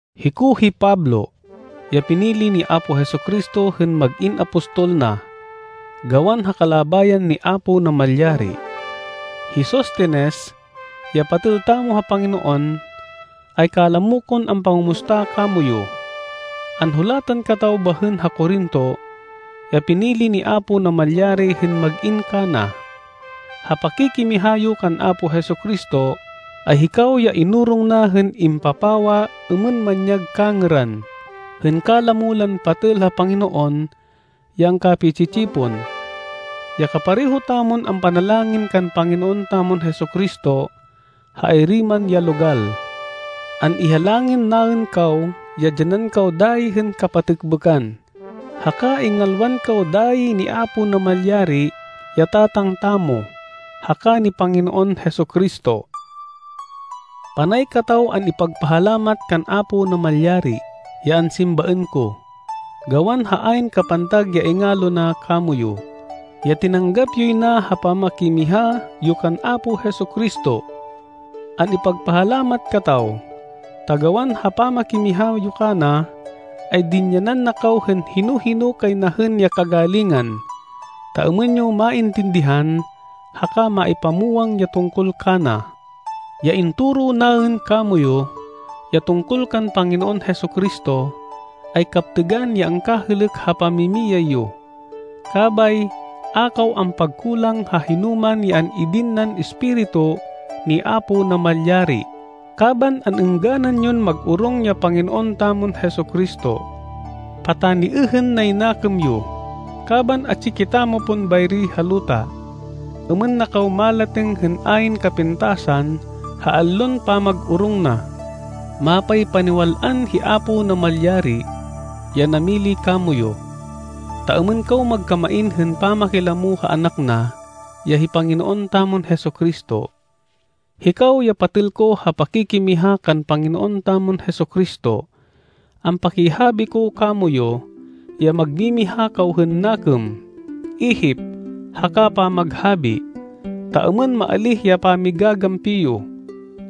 Hiko hi Pablo, ya pinili ni Apo Jesu-Cristo hên mag-in apostol na, gawan ha kalabayan ni Apo Namalyari. Hi Sostenes, ya patêl tamo ha Panginoon, ay kalamo kon ampangumusta kamoyu. Anhulatan kataw bahên ha Corinto, ya pinili ni Apo Namalyari hên mag-in kana. Ha pakikimiha yo kan Apo Jesu-Cristo, ay hikaw ya inorong na hên impapawa êmên manyag kangêran, hên kalamo lan patêl ha Panginoon ya angkapi-tsi-tsipon, ya kapareho tamon ampanalangin kan Panginoon tamon Jesu-Cristo, ha ayri man ya logal. An-ihalangin naên kaw ya dyanan kaw dayi hên kapatêkbêkan, haka ingalwan kaw dayi ni Apo Namalyari ya Tatang tamo, haka ni Panginoon Jesu-Cristo. Panay kataw an-ipagpahalamat kan Apo Namalyari, ya ansimbaên ko, gawan ha ayn kapantag ya ingalo na kamoyu, ya tinanggap yoy na ha pamakimiha yo kan Apo Jesu-Cristo. An-ipagpahalamat kataw, ta gawan ha pamakimiha yo kana, ay dinyanan na kaw hên hino-hino kay na hên ya kagalingan, ta êmên yo maintindihan haka maipamwang ya tungkol kana. Ya intoro naên kamoyu, ya tungkol kan Panginoon Jesu-Cristo, ay kaptêgan ya angkahêlêk ha pamimiyay yo. Kabay a kaw ampagkulang ha hinoman ya an-idin nan Espiritu ni Apo Namalyari, kaban an-êngganan yon mag-orong ya Panginoon tamon Jesu-Cristo. Pataniêhên nay nakêm yo, kaban atsi kitamo pon bayri ha luta, êmên na kaw malatêng hên ayn kapintasan ha allon pamag-orong na. Mapaypaniwal-an hi Apo Namalyari, ya namili kamoyu, ta êmên kaw magkamain hên pamakilamo ha Anak na, ya hi Panginoon tamon Jesu-Cristo. Hikaw ya patêl ko ha pakikimiha kan Panginoon tamon Jesu-Cristo, ampakihabi ko kamoyu, ya magmimiha kaw hên nakêm, ihip haka pamaghabi, ta êmên maalíh ya pami-gagampi yo.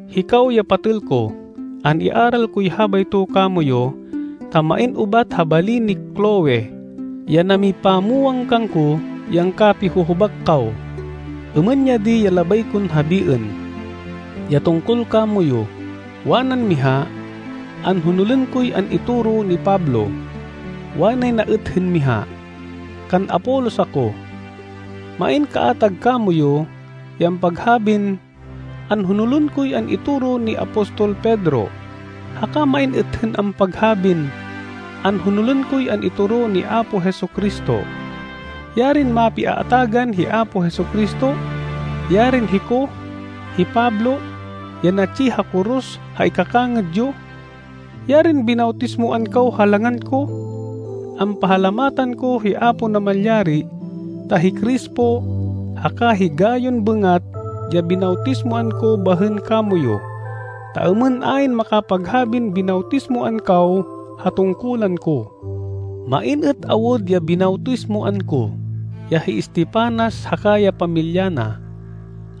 Hikaw ya patêl ko, an-iaral koy habayto kamoyu, ta main ubat ha bali ni Cloe, ya namipamwang kangko ya angkapi-huhubak kaw. Êmên ya di ya labay kon habiên, ya tungkol kamoyu: wanan miha, “Anhonolên koy an-itoro ni Pablo.” Wanay na êt hên miha, “Kan Apolos ako.” Main kaatag kamoyu ya ampaghabin, “Anhonolên koy an-itoro ni apostol Pedro.” Haka main êt hên ampaghabin, “Anhonolên koy an-itoro ni Apo Jesu-Cristo.” Yarin mapiaatagan hi Apo Jesu-Cristo! Yarin hiko, hi Pablo, ya natsi ha koros ha ikakangêd yo! Yarin binawtismoan kaw ha langan ko! Ampahalamatan ko hi Apo Namalyari ta hi Crispo haka hi Gayon bêngat ya binawtismoan ko bahên kamoyu, ta êmên ayn makapaghabin binawtismoan kaw ha tungkulan ko. (Main êt awud ya binawtismoan ko, ya hi Estefanas haka ya pamilya na.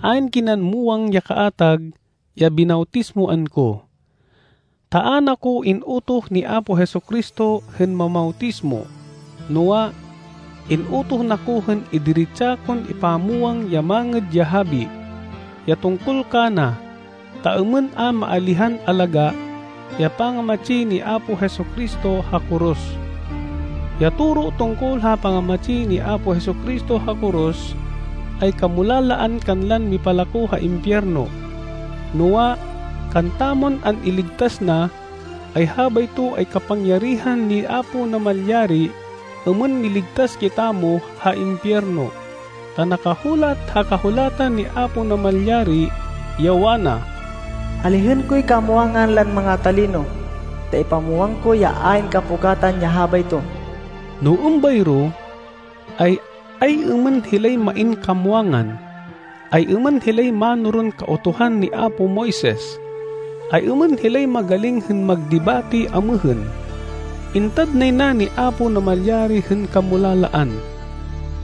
Ayn kinan muwang ya kaatag ya binawtismoan ko.) Ta a na ko in-utoh ni Apo Jesu-Cristo hên mamawtismo, noa, in-utoh na ko hên idiretsa kon ipamwang ya Mangêd ya Habi, ya tungkol kana ta êmên a maalihan alagá ya pangamatsi ni Apo Jesu-Cristo ha koros. Ya toro tungkol ha pangamatsi ni Apo Jesu-Cristo ha koros ay kamulalaan kanlan mipalako ha impiyerno. Noa, kantamon an-iligtas na, ay habayto ay kapangyarihan ni Apo Namalyari êmên miligtas kitamo ha impiyerno. Ta nakahulat ha Kahulatan ni Apo Namalyari, ya wana, “Alihên koy kamwangan lan manga-talino, ta ipamwang ko ya ayn kapukatan ya habayto.” No êmbayro, ay ay-êmên hilay main kamwangan? Ay-êmên hilay mánoron Kautuhan ni apo Moises? Ay-êmên hilay magaling hên magdebate amêhên. Intad nay na ni Apo Namalyari hên kamulalaan,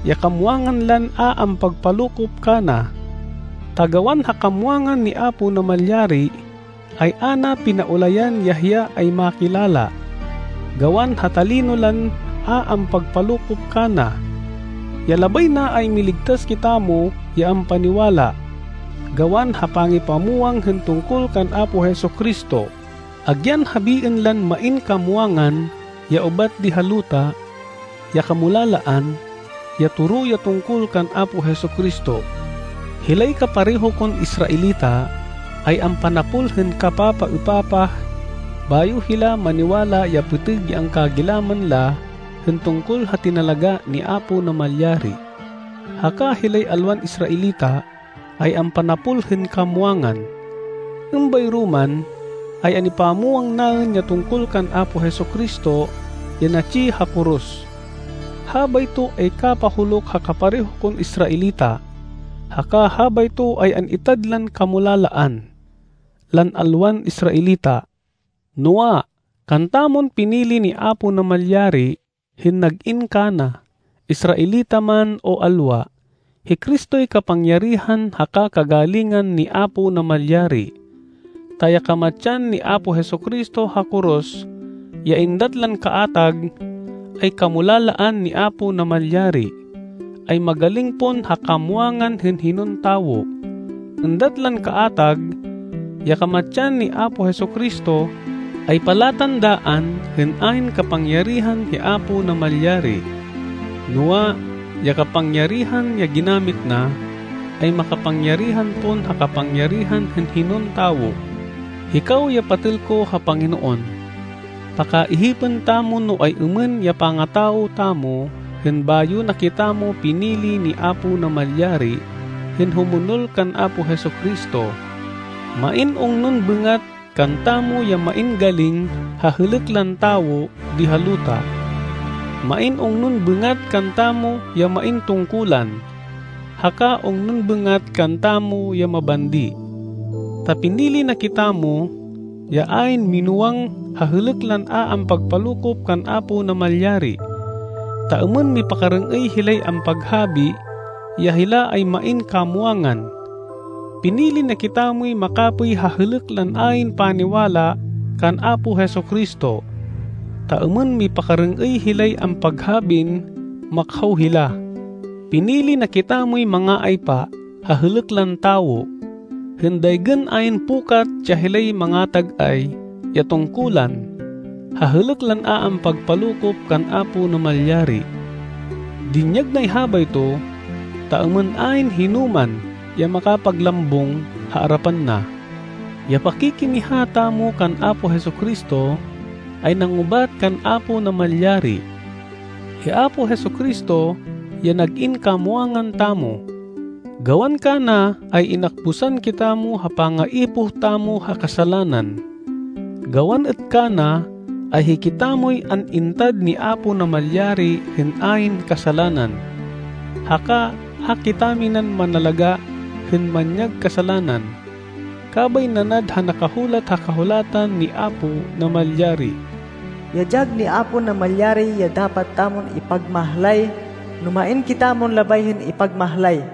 ya kamwangan lan a ampagpalokop kana. Ta gawan ha kamwangan ni Apo Namalyari, ay a na pinaulayan ya hiya ay makilala, gawan ha talino lan a ampagpalokop kana. Ya labay na ay miligtas kitamo ya ampaniwala, gawan ha pangipamwang hên tungkol kan Apo Jesu-Cristo, agyan habiên lan main kamwangan ya ubat di ha luta, ya kamulalaan, ya toro ya tungkol kan Apo Jesu-Cristo. Hilay kapareho kon Israelita, ay ampanapol hên kapapaêpapah, bayo hila maniwala ya pêtêg ya angkagilaman la hên tungkol ha tinalagá ni Apo Namalyari. Haka hilay alwan Israelita, ay ampanapol hên kamwangan. Êmbayro man, ay an-ipamwang naên ya tungkol kan Apo Jesu-Cristo ya natsi ha koros. Habayto ay kapahuluk ha kapareho kon Israelita. Haka habayto ay an-itad lan kamulalaan, lan alwan Israelita. Noa, kantamon pinili ni Apo Namalyari, hên nag-in kana, Israelita man, o alwa, hi Cristoy kapangyarihan haka kagalingan ni Apo Namalyari. Ta ya kamatsan ni Apo Jesu-Cristo ha koros, ya êndat lan kaatag, ay kamulalaan ni Apo Namalyari, ay magaling pon ha kamwangan hên hinon tawo. Êndat lan kaatag ya kamatsan ni Apo Jesu-Cristo, ay palatandaan hên ayn kapangyarihan hi Apo Namalyari, noa, ya kapangyarihan ya ginamit na, ay makapangyarihan pon ha kapangyarihan hên hinon tawo. Hikaw ya patêl ko ha Panginoon, pakaihipên tamo no ay-êmên ya pangatawo tamo hên bayo na kitamo pinili ni Apo Namalyari hên humonol kan Apo Jesu-Cristo. Main ungnon bêngat kantamo ya main galing ha hêlêk lan tawo di ha luta. Main ungnon bêngat kantamo ya main tungkulan. Haka ungnon bêngat kantamo ya mabandi. Ta pinili na kitamo, ya ayn minúwang ha hêlêk lan a ampagpalokop kan Apo Namalyari, ta êmên mipakarêng-êy hilay ampaghabi ya hila ay main kamwangan. Pinili na kitamoy makapêy ha hêlêk lan ayn paniwala kan Apo Jesu-Cristo, ta êmên mipakarêng-êy hilay ampaghabin makhaw hila. Pinili na kitamoy manga-aypa ha hêlêk lan tawo, hên daygên ayn pukat ya hilay manga-tag-ay ya tungkulan ha hêlêk lan a ampagpalokop kan Apo Namalyari. Dinyag nay habayto, ta êmên ayn hinoman ya makapaglambung ha arapan na. Ya pakikimiha tamo kan Apo Jesu-Cristo, ay nangubat kan Apo Namalyari. Hi Apo Jesu-Cristo ya nag-in kamwangan tamo. Gawan kana ay inakbusan kitamo ha pangaipoh tamo ha kasalanan. Gawan êt kana ay hikitamoy an-intad ni Apo Namalyari hên ayn kasalanan, haka a kitaminan manalagá hên manyag kasalanan. Kabay nanad ha nakahulat ha Kahulatan ni Apo Namalyari, “Ya dyag ni Apo Namalyari ya dapat tamon ipagmahlay no main kitamon labay hên ipagmahlay.”